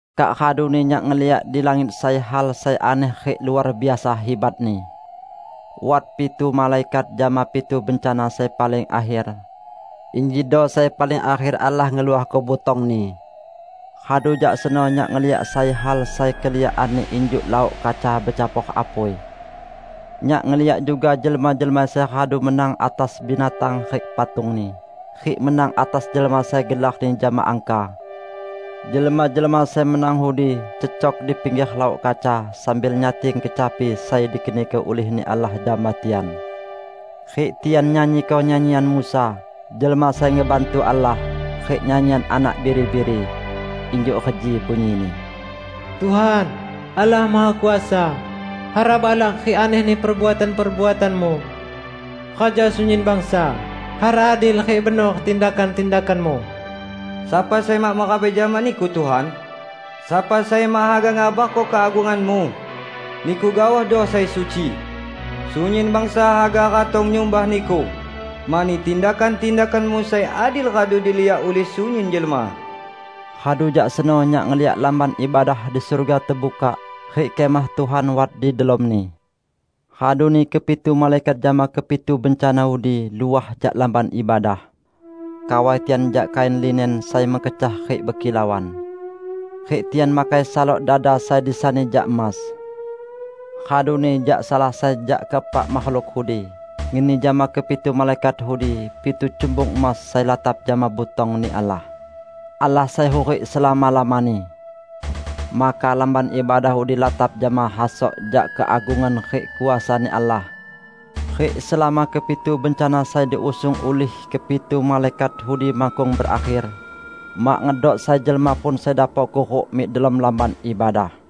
Kak raduni nyak ngeliak di langit sai hal sai aneh rik luar biasa hibatni. Wat pitu malaikat jama pitu bencana sai paling akher. Injido sai paling akher Allah ngeluahko butong-Ni. Radu jak seno nyak ngeliak sai hal sai keliakanni injuk laok kaca becampor apui. Nyak ngeliak juga jelma-jelma sai radu menang atas binatang rik patungni, rik menang atas jelma sai gelarni jama angka. Jelma-jelma sai menang udi cecok di pingger laok kaca sambil nyating kecapi sai dikeniko ulih-Ni Allah jama tian. Rik tian nyanyiko nyanyian Musa, jelma sai ngebantu Allah, rik nyanyian Anak Biri-biri. Injuk reji bunyini, "Tuhan, Allah Mahakuasa, hara balak rik anehni perbuatan-perbuatan-Mu! Raja sunyin bangsa, hara adil rik benor tindakan-tindakan-Mu! Sapa sai mak merabai jama Niku, Tuhan? Sapa sai mak haga ngabarko keagungan-Mu. Niku gaohdo sai suci. Sunyin bangsa haga ratong nyumbah Niku mani tindakan-tindakan-Mu sai adil radu diliak ulih sunyin jelma." Radu jak seno nyak ngeliak Lamban Ibadah di surga tebukak, rik Kemah Tuhan wat di delomni. Raduni kepitu malaikat jama kepitu bencana udi luah jak Lamban Ibadah. Kawai tian jak kain linen sai mekecah rik bekilauan. Rik tian makai salok dada sai disani jak emas. Raduni jak salah sai jak keepak makhluk udi ngeni jama kepitu malaikat udi pitu cumbung emas sai latap jama butong-Ni Allah, -- Allah sai hurik selama-lamani. Maka Lamban Ibadah udi latap jama hasok jak keagungan rik kuasa-Ni Allah. Rik selama kepitu bencana sai diusung ulih kepitu malaikat udi makkung berakher, mak ngedok sai jelma pun sai dapok kuruk mik delom Lamban Ibadah.